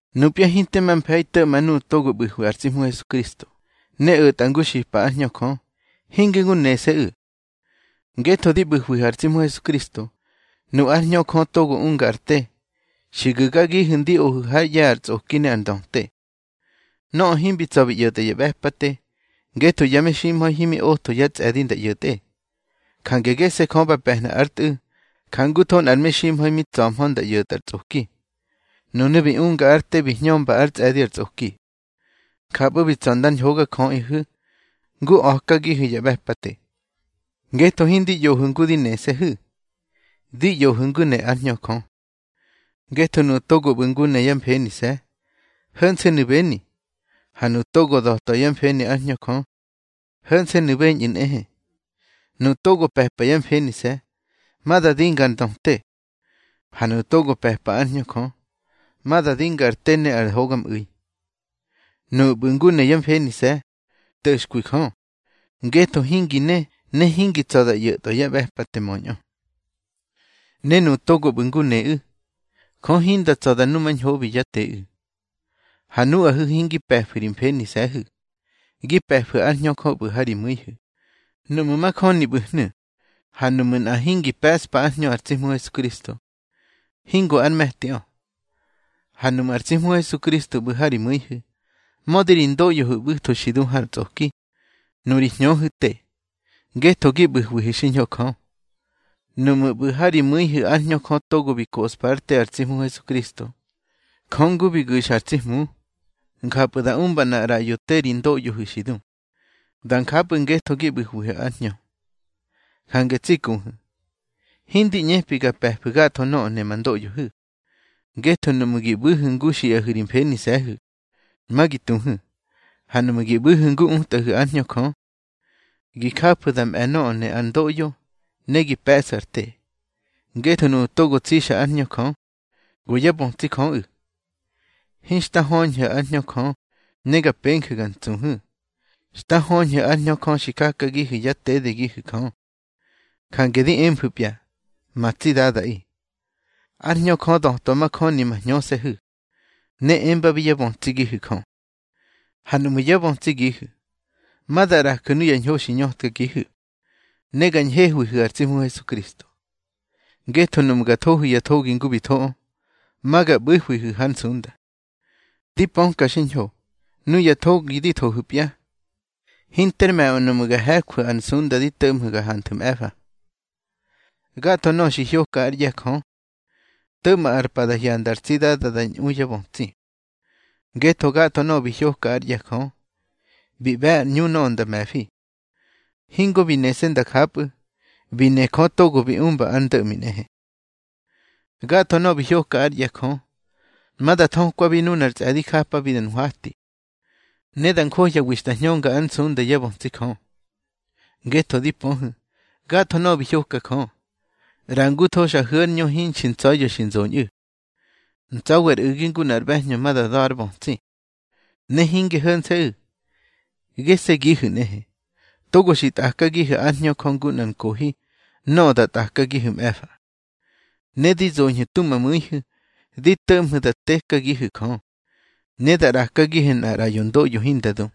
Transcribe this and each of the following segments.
Nupya hinte ma mfe̱i to̱ꞌma nuꞌu̱ togo ꞌbu̱hwi ar tsi Hmu Hesukristo, ne o̱tꞌa ngu xipa ár Hñö Jö, hinge ngu nese̱ꞌu̱. Ngetho di ꞌbu̱hwihu̱ ar tsi Hmu Hesukristo, nu ár Hñö Jö togo unga ar te, xi gu̱gagihu̱ ndi ohu̱ hár ꞌye̱ ar tsꞌoki ne ar ndöte. Nöꞌö himbi tsa̱ bi ꞌyo̱tꞌa ya ꞌbe̱pate, ngetho ya meximha̱i himi otho yá tsꞌe̱di nda ꞌyo̱tꞌe, jange gese̱ Jö ba pe̱hna ár Tꞌu̱, jangutho nꞌar meximha̱i mi tsa̱hmö nda ꞌyo̱tꞌa ar tsꞌoki. Nunu̱ bi unga ár te bi hñömba ár tsꞌe̱di ar tsꞌoki. Njapꞌu̱ bi tsa̱ ndar hogajöꞌihu̱ ngu a̱kagihu̱ ya ꞌbe̱pate. Ngetho hindi ꞌyohu̱ ngu di nese̱hu̱, di ꞌyohu̱ ngu ne ár Hñö Jö. Ngetho nuꞌu̱ togo ꞌbu̱ ngu ne yá mfenise̱, ho̱nse̱nu̱ beni. Ha nuꞌu̱ togo da̱twa yá mfeni ár Hñö Jö, ho̱nse̱nu̱ beñꞌu̱ nꞌehe. Nuꞌu̱ togo pe̱pa yá mfenise̱, ma da dinga ar ndöte. Ha nuꞌu̱ togo pe̱pa ár Hñö Jö, ma da dinga ar te ne ar hogamꞌu̱i. Nuꞌu̱ ꞌbu̱ ngu ne yá mfenise̱, nto̱xkwi Jö, ngetho hingi ne, ne hingi tsa̱ da ꞌyo̱twa yá ꞌbe̱pate möñꞌö. Ne nuꞌu̱ togo ꞌbu̱ ngu neꞌu̱, Jö hinda tsa̱ da numañhobi yá teꞌu̱. Ha nuꞌahu̱ hingi pe̱fu̱ ri mfenise̱hu̱, gi pe̱fu̱ ár Hñö Jö ꞌbu̱ ha ri mu̱ihu̱, nuꞌmu̱ majöni ꞌbu̱hnu̱. Ha nuꞌmu̱ nꞌa hingi pe̱ꞌspa ár Hñö ar tsi Hmu Hesukristo, hingo ár me̱tiꞌö. Ha nuꞌmu̱ ar tsi Hmu Hesukristo ꞌbu̱ ha ri mu̱ihu̱, mödi ri ndoꞌyohu̱ ꞌbu̱tho xi du har tsꞌoki, nuri hñöhu̱ te, ngetho gi ꞌbu̱hwihu̱ xiñho Jö. Nuꞌmu̱ ꞌbu̱ ha ri mu̱ihu̱ ár Hñö Jö togo bi koꞌspa ár te ar tsi Hmu Hesukristo, Jö, ngu bi gu̱xa ar tsi Hmu, njapꞌu̱ da umba nꞌar ꞌraꞌyo te ri ndoꞌyohu̱ xi du. Da njapꞌu̱ ngetho gi ꞌbu̱hwihu̱ ár Hñö. Jange tsi kuhu̱, hindi ꞌñepi ga pe̱fu̱ gatho nöꞌö ne ma ndoꞌyohu̱. Ngetho nuꞌmu̱ gi ꞌbu̱hu̱ ngu xiꞌahu̱ ri mfenise̱hu̱, ma gi tuhu̱. Ha nuꞌmu̱ gi ꞌbu̱hu̱ ngu utꞌahu̱ ár Hñö Jö, gi jafu̱ da mꞌe̱ nöꞌö ne ar ndoꞌyo, ne gi pe̱ꞌsu̱ ar te. Ngetho nuꞌu̱ togo tsixa ár Hñö Jö, go yá bötsi Jöꞌu̱. Hinxta höñhu̱ ár Hñö Jö ne ga penju̱ ga ntsuhu̱. Xta höñhu̱ ár Hñö Jö xi jakagihu̱ yá tedegihu̱ Jö. Jange di emfu̱pya: Ma tsi Dadaꞌi. Ár Hñö Jö da̱twa majöni ma hñöse̱hu̱, ne embabi yá bötsigihu̱ Jö. Ha nuꞌmu̱ yá bötsigihu̱, ma da ꞌraju̱ nuya ñho xi ñötkagihu̱, ne ga ñhehwihu̱ ar tsi Hmu Hesukristo. Ngetho nuꞌmu̱ ga thohu̱ ya thogi ngu bi thoꞌö, ma ga ꞌbu̱hwihu̱ hár nsunda. Di pöka xiñho, nuya thogi di thohu̱pya, hinter me̱ꞌö nuꞌmu̱ ga he̱jwu̱ ar nsunda di to̱ꞌmhu̱ ga hanthu̱ mꞌe̱fa. Gatho nöꞌö xi hyoka ár ꞌye̱ Jö, to̱ꞌma ar pa da hyanda ar tsi Dada da ñꞌu yá bötsi. Ngetho gatho nöꞌö bi hyoka ár ꞌye̱ Jö, bi ꞌbe̱ ar ꞌñu nöꞌö nda me̱fi. Hingo bi nese̱ nda njapꞌu̱, bi ne Jö togo bi umba ar ndo̱ꞌmi nꞌehe. Gatho nöꞌö bi hyoka ár ꞌye̱ Jö, ma da thökwabi nunar tsꞌe̱di japabi da nhwati, ne da njohyawi xta hñönga ár nsunda yá bötsi Jö. Ngetho di pöhu̱, gatho nöꞌö bi hyoka Jö, ꞌrangutho xa hu̱ ár ñö hinxi ntsa̱ya̱ xi nzoñꞌu̱, ntsa̱wi ar u̱gi ngu nꞌar ꞌbe̱hñö ma da da̱ ár bötsi. Ne hinge ho̱nse̱ꞌu̱. Gese̱gihu̱ nꞌehe, togo xi tꞌakagihu̱ ár Hñö Jö ngu nꞌar nkohi nöꞌö da tꞌakagihu̱ mꞌe̱fa. Ne di zoñhu̱ tu ma mu̱ihu̱ di to̱ꞌmhu̱ da tekagihu̱ Jö, ne da ꞌrakagihu̱ nꞌar ꞌraꞌyo ndoꞌyo hinda du.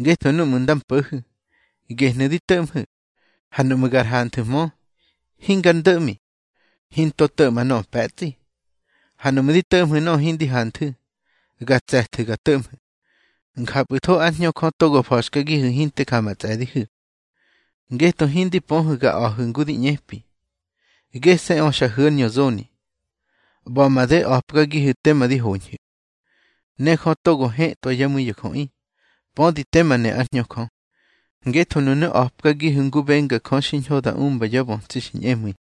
Ngetho núꞌmu̱ nda mpo̱hu̱, gehnu̱ di to̱ꞌmhu̱. Ha nuꞌmu̱ gar hanthu̱hmö, hingar ndo̱ꞌmi. Hinto to̱ꞌma nöꞌö pe̱tsꞌi. Ha nuꞌmu̱ di to̱ꞌmhu̱ nöꞌö hindi hanthu̱, ga tse̱thu̱ ga to̱ꞌmhu̱. Njapꞌu̱tho ár Hñö Jö togo fa̱xkagihu̱ hinte ja ma tsꞌe̱dihu̱. Ngetho hindi pöhu̱ ga a̱hu̱ ngu di ꞌñepi. Gese̱ꞌö xa hu̱ ár ñö zoni, ꞌba̱ made a̱pkagihu̱ tema di hoñhu̱. Ne Jö togo hetꞌwa yá mu̱i ya jöꞌi, pödi tema ne ár Hñö Jö. Ngetho nunu̱ a̱pkagihu̱ ngu benga Jö xiñho da umba yá bötsi xi ñꞌemu̱i.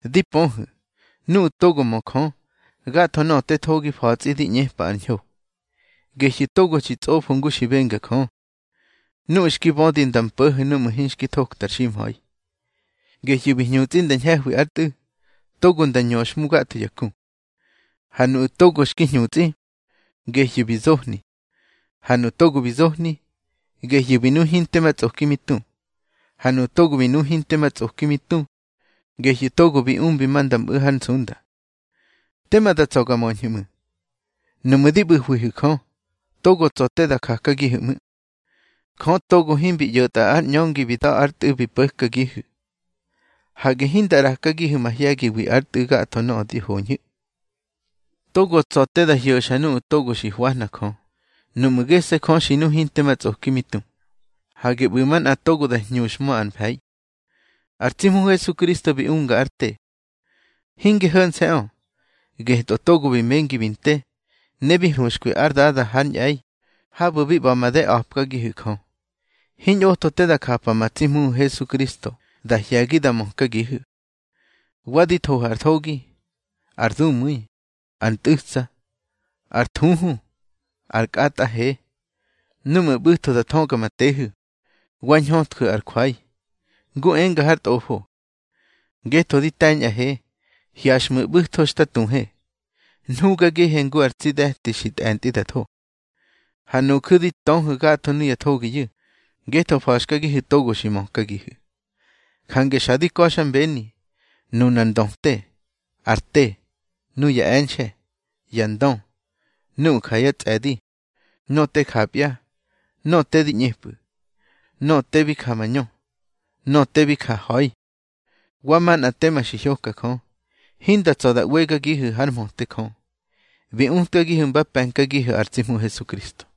Di pöhu̱, nuꞌu̱ togo mö Jö, gatho nöꞌö te thogi fa̱tsꞌi di ꞌñepa ar ñho, gehyu̱ togo xi tsꞌofo ngu xi benga Jö. Nuꞌu̱ xki bödi nda mpo̱ho̱ núꞌmu̱ hinxki thokta ar ximha̱i, gehyu̱ bi hñutsꞌi nda ñhe̱hwi ár Tꞌu̱, togo nda ñöxhmu gatho ya ku. Ha nuꞌu̱ togo xki hñutsꞌi, gehyu̱ bi zohni. Ha nuꞌu̱ togo bi zohni, gehyu̱ bi nu hinte ma tsꞌoki mi tu. Ha nuꞌu̱ togo bi nu hinte ma tsꞌoki mi tu, gehyu̱ togo bi umbi nda mꞌu̱ hár nsunda. Tema da tsa̱ ga möñhu̱ ꞌmu̱. Nuꞌmu̱ di ꞌbu̱hwihu̱ Jö, togo tsa̱ te da jakagihu̱ ꞌmu̱. Jö togo himbi ꞌyo̱tꞌa ár ꞌñöngi bi da̱ ár Tꞌu̱ bi po̱kagihu̱, hage hinda ꞌrakagihu̱ mahye̱giwi ár Tꞌu̱ gatho nöꞌö di hoñhu̱. Togo tsa̱ te da hyo̱xa nuꞌu̱ togo xi hwahna Jö, nuꞌmu̱ gese̱ Jö xi nu hinte ma tsꞌoki mi tu. Hage ꞌbu̱ manꞌa togo da hñuxhmö ar mfe̱i. Ar tsi Hmu Hesukristo bi unga ár te. Hinge ho̱nse̱ꞌö, getꞌö togo bi mengi bi nte, ne bi huxkwi ár Dada hár ñꞌe̱i, habu̱ bi ꞌba̱ made a̱pkagihu̱ Jö. Hiñꞌotho te da japa ma tsi Hmuhu̱ Hesukristo da hye̱gi da mökagihu̱. Wa di thohu̱ ar thogi, ar dumu̱i, ar ntꞌu̱tsa, ar thuhu, ar kꞌatꞌa he. Núꞌmu̱ ꞌbu̱tho da thöga ma tehu̱, wa ñhötju̱ ar jwai. Ngu enga har Tꞌofo: Ngetho di te̱ñꞌahe, hyaxꞌmu̱ ꞌbu̱tho xta tuhe. Nhugagihe ngu ar tsi de̱ti xi tꞌe̱ntꞌi da tho. Ha nuju̱ di töhu̱ gatho nuya thogiyu̱, ngetho fa̱xkagihu̱ togo xi mökagihu̱. Jange xa di ka̱xmbeni, nunar ndöte, ar te, nuya e̱nxe̱, ya ndö, nuꞌu̱ ja yá tsꞌe̱di, nöꞌö te japya, nöꞌö te di ꞌñepꞌu̱, nöꞌö te bi ja mañö, nöꞌö te bi ja ha̱i, wa manꞌa tema xi hyoka Jö, hinda tsa̱ da ꞌwegagihu̱ hár mhöte Jö, bi utkagihu̱ mba pe̱nkagihu̱ ar tsi Hmu Hesukristo.